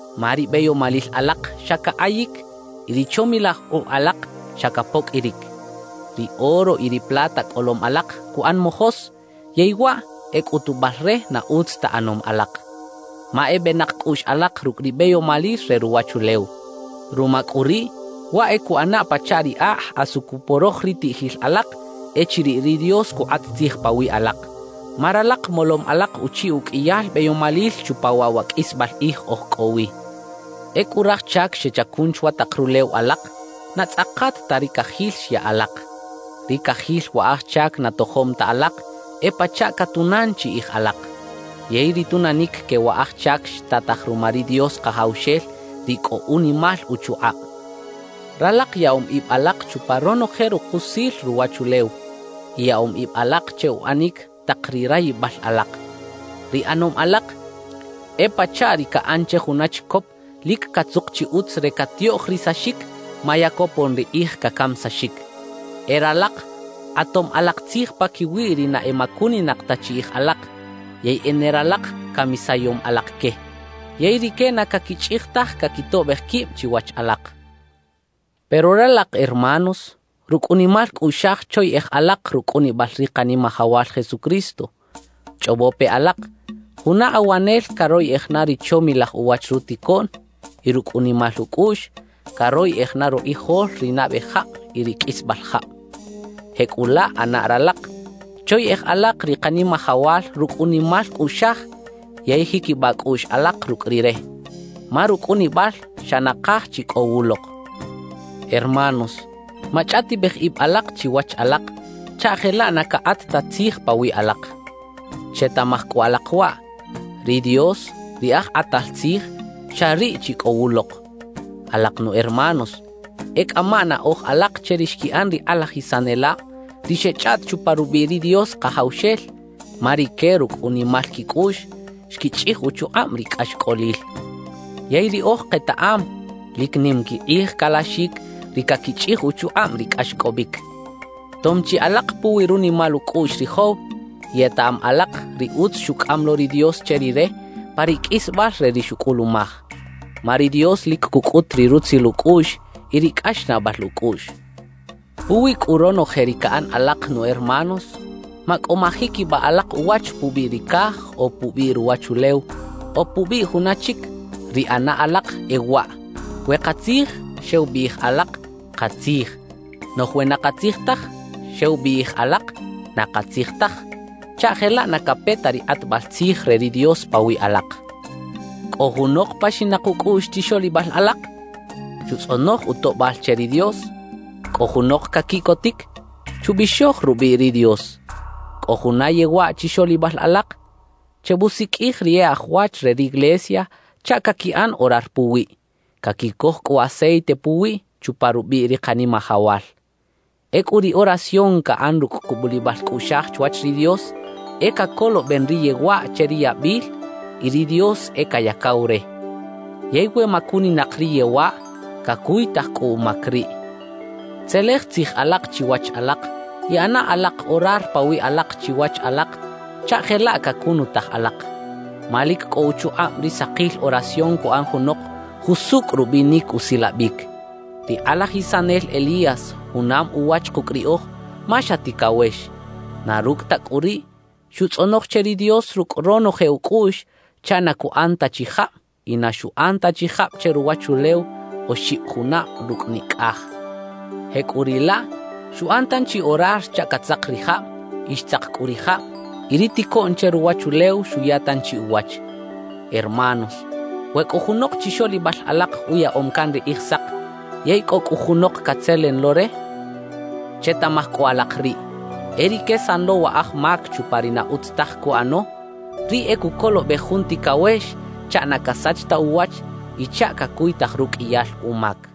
Ma ri beyomalil alak xa cakꞌayic y ri chomilaj kꞌuꞌ alak xa capoqꞌuiric. Ri oro y ri plata cꞌolom alak cuꞌan mojos, yey waꞌ e cꞌutubal re na utz ta ꞌanom alak, ma e benak cꞌuꞌx alak rucꞌ ri beyomalil re ruwachulew. Ruma cꞌu riꞌ, waꞌ e cuꞌana pachaꞌ ri akꞌ asu cuporoj ri tiꞌjil alak echiriꞌ ri Dios cukꞌat tzij pawiꞌ alak, ma ralak molom alak uchiꞌ uqꞌuiyal beyomalil chupa waꞌ wa qꞌuisbal kꞌij oj cꞌo wi. Ecꞌu raj chac xechacun chwa tak rulew alak, na tzꞌakat ta ri cajil xya alak. Ri cajil wa aj chac na tojom ta alak e pachaꞌ catunan chiꞌij alak. Yey ri tunanic que wa aj chac xtataj ruma ri Dios Kajawxel ri cꞌo unimal uchukꞌab. Ralak yaꞌom ib alak chupa ronoje rukusil ruwachulew y yaꞌom ib alak che uꞌanic tak ri rayibal alak. Ri ꞌanom alak e pachaꞌ ri caꞌan che juna chicop lic catzuk chi utz re catiꞌoꞌjrisaxic ma ya copon ri kꞌij cacamisaxic. E ralak kꞌatom alak tzij paquiwi ri na emacuninak ta chiꞌij alak yey e ne ralak camisayom alak que. Yey rique na caquichꞌij taj caquitoꞌbej quib chiwach alak. Pero ralak hermanos, rucꞌ unimal cꞌuꞌxaj choyeꞌej alak rucꞌunibal ri Kanimajawal Jesucristo. Chꞌobo pe alak, juna awanel caroyꞌej na ri chomilaj uwach ruticoꞌn y rucꞌ unimal ucꞌuꞌx caroyꞌej na rukꞌijol ri nabe jab y ri qꞌuisbal jab. Jecꞌulaꞌ ꞌana ralak, choyeꞌej alak ri Kanimajawal rucꞌ unimal cꞌuꞌxaj yey jiquibaꞌ cꞌuꞌx alak rucꞌ Rire, ma rucꞌunibal xa nakaj chi cꞌo wulok. Hermanos, machꞌaꞌtibej ib alak chiwach alak chaꞌ jelaꞌ na cakꞌat ta tzij pawiꞌ alak. Chetaꞌmaj cꞌu alak waꞌ: Ri Dios, ri Aj Kꞌatal Tzij, xa riꞌ chi cꞌo wulok. Alak nu hermanos, e cꞌama naꞌoj alak che ri xquiꞌan ri kꞌalajisanelab ri xechꞌaꞌt chupa rubiꞌ ri Dios Kajawxel, ma rique rucꞌ unimal quicꞌuꞌx xquichꞌij uchukꞌab ri cꞌaxcꞌolil. Yey riꞌoj ketaꞌam lic nim quikꞌij calaxic ri caquichꞌij uchukꞌab ri cꞌaxcꞌobic. Tom chi alak puwi runimal ucꞌuꞌx ri Job y etaꞌam alak ri utz xucꞌam lo ri Dios che rire pa ri qꞌuisbal re ri xucꞌulumaj. Ma ri Dios lic cucꞌut ri rutzil ucꞌuꞌx y ri cꞌaxnaꞌbal ucꞌuꞌx. Puwi cꞌu ronoje ri caꞌan alak nu hermanos, macꞌo majiquibaꞌ alak uwach pubiꞌ ri caj o pubiꞌ ruwachulew o pubiꞌ juna chic. Ri ꞌana alak e waꞌ: We katzij, xew biꞌij alak: «Katzij»; noꞌj we na katzij taj, xew biꞌij alak: «Na katzij taj» chaꞌ jelaꞌ na cape ta ri kꞌatbal tzij re ri Dios pawiꞌ alak. ¿Cꞌo junok paxinak ucꞌuꞌx chixoꞌlibal alak? Chutzꞌonoj utoꞌbal che ri Dios. ¿Cꞌo junok caquiꞌcotic? Chubixoj rubiꞌ ri Dios. ¿Cꞌo juna yewaꞌ chixoꞌlibal alak? Chebusiqꞌuij ri e aj wach re riglesia chaꞌ caquiꞌan orar puwiꞌ, caquicoj cꞌu aceite puwiꞌ chupa rubiꞌ ri Kanimajawal. Ecꞌu ri oración caꞌan rucꞌ cubulibal cꞌuꞌxaj chwach ri Dios, e cacoloben ri yewaꞌ che ri yabil y ri Dios e cayacaw re. Yey we macuninak ri yewaꞌ, cacuytaj cꞌu umac riꞌ. Tzelej tzij alak chiwach alak y ꞌana alak orar pawiꞌ alak chiwach alak chaꞌ jelaꞌ cacunutaj alak. Ma lic cꞌo uchukꞌab ri sakil oración cuꞌan junok jusucꞌ rubinic usilabic. Ri kꞌalajisanel Elías junam uwach kucꞌ riꞌoj ma xa ticawex. Na rucꞌ ta cꞌu riꞌ, xutzꞌonoj che ri Dios rucꞌ ronoje ucꞌuꞌx chaꞌ na cuꞌan ta chi jab y na xuꞌan ta chi jab che ruwachulew oxib junab rucꞌ nicꞌaj. Jecꞌuriꞌlaꞌ, xuꞌan tanchi orar chaꞌ catzak ri jab; y xtzak cꞌu ri jab y ri ticoꞌn che ruwachulew xuya tanchi uwach. Hermanos, we cꞌo junok chixoꞌlibal alak uyaꞌom can ri Kꞌijsak, yey cꞌo cꞌu junok catzelen lo re, chetaꞌmaj cꞌu alak riꞌ: E ri quesan lo wa aj mac chupa ri na utz taj cuꞌano, riꞌ e cucolobej jun ticawex chaꞌ na casach ta uwach y chaꞌ cacuytaj ruqꞌuiyal umac.